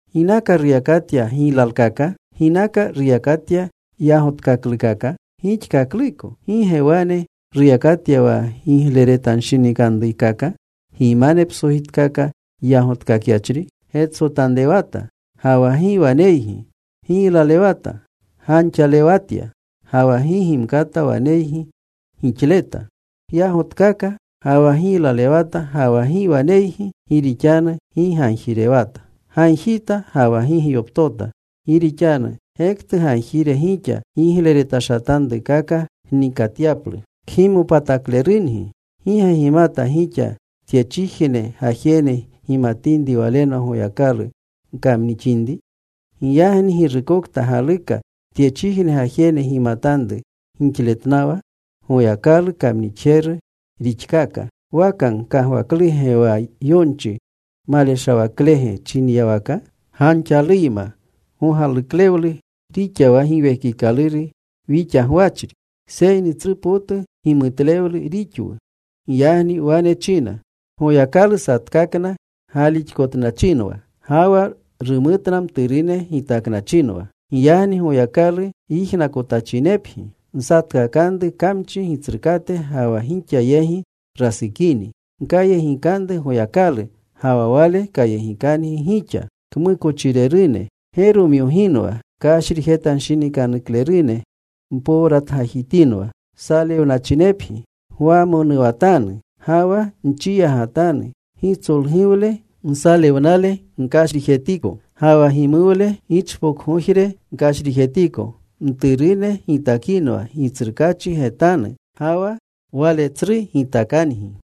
¿Ginaka ruyakatya giylalkaka? ¿Ginaka ruyakatya yagotkaklukaka gixkakluko? ¿Gi ge wane ruyakatya wa gigleretashatanruykaka gimane psojitkaka yagotkakyachri? Getsotanrewata ga wa gi waneygi. Giylalewata. Ganxalewatya. Ga wa gi gimkata waneygi gixleta. Gyagotkaka ga wa giylalewata ga wa gi waneygi, gi rixanu gi gagjirewata. Gagjita ga wa gi gyoptota, gi rixanu gektu gagjire gixa, gigleretashatanrukaka gnikatyaplu. Kgimopataklerungi. ¿Gi ge gimata gixa tyechijne gajene gimatinri walenwa Goyakalu gkamnixinri? Giyagni girukokta galuka tyechijne gajene gimatanru gixletnawa, Goyakalu kamnixjeru rixkaaka. ¿Waka gkagwakluge wa yonchi maleshawaklege chinyawaka: “Ganxaluyma gogaluklewlu rixa wa Giwekikaluru wixa gwachri?” Seyni tsru potu gimutlewlu rixwu. Giyagni wane china: Goyakalu satkakna galixkotnachinwa, ga wa rumutna mturune gitaknachinwa. Giyagni Goyakalu yijnakotachinepgi. Nsatkakanru kamchi gitsrukate ga wa gixa yegi rasukini. Gkayegikanru Goyakalu, ga wa Wale kayegikangi gixa. Kmukochirerune, geromyoginwa. Kashrijtanshinikanuklerune, mpowratgajitinwa. Salewnachinepgi. Gwamonuwatanu, ga wa nchiyagatanu. Gitsolguwle nsalewnale gkashrijetiko. Ga wa gimuwle gichpokgojre kashrijetiko. Mturune gitakinwa Gitsrukaachi getanu, ga wa Wale tsru gitakangi.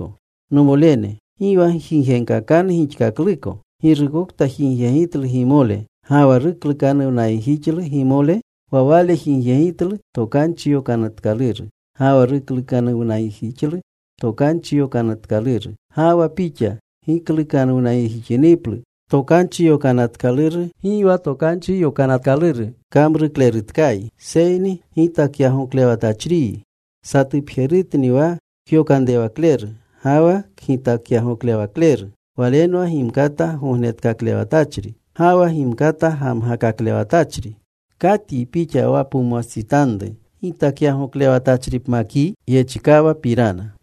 Nomolene, gi wa gjigyegkakanu gixkakluko. Girukokta jigyegitlu gimole ga wa ruklukanuwnayegjixlu gimole, wa wale jigyegitlu Tokanchi Yokanatkaluru, ga wa ruklukanuwnayegjixlu Tokanchi Yokanatkaluru. Ga wa pixa giklukanuwnayegjixiniplu Tokanchi Yokanatkaluru, gi wa Tokanchi Yokanatkaluru kamruklerutkayi seyni gitakyagoklewatachriyi. Satupjerutni wa kyokanrewakleru ga wa kgitakyagoklewakleru. Walenwa gimkata gognetkaklewletachri ga wa gimkata gamgakaklewletachri. ¿Katyi pixa wa pumwastsitanru gitakyagoklewachripmakyi?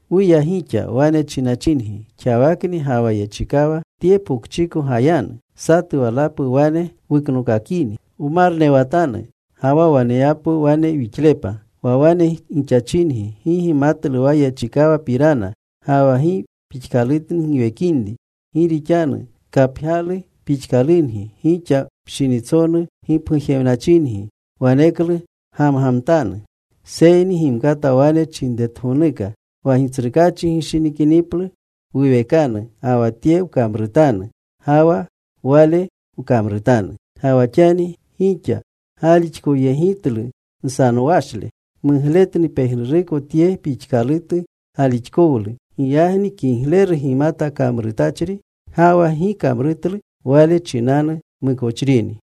Wuya gixa, wane chinachingi, “Xawakni ga wa yechikawa tye pokchiko gayanu. Satu walapu wane wuknokakini. Wmarnewatanu ga wa waneyapwu wane wixlepa.” Wa wane gixachingi gi gimatlu wa yechikawapirana, ga wa gi pixkalutni giwekinri. Gi rixanu kapgyalu pixkalungi gixa, pshinitsonu gipgujewnachingi. Waneklu gamgamtanu. Seyni gimkata wane chinretgonuka, “Wa Gitsrukaachi gishinikiniplu, wuwekanu ga wa tye wkamrutanu ga wa wale wkamrutanu.” Ga wa xani gixa galixkowyegitlu nsanowashle. Mugletni pejnuruko tye pixkalutu galixkowlu. Giyagni kigleru gimata kamrutachri, ga wa gi kamrutlu, wale chinanu mukochrini.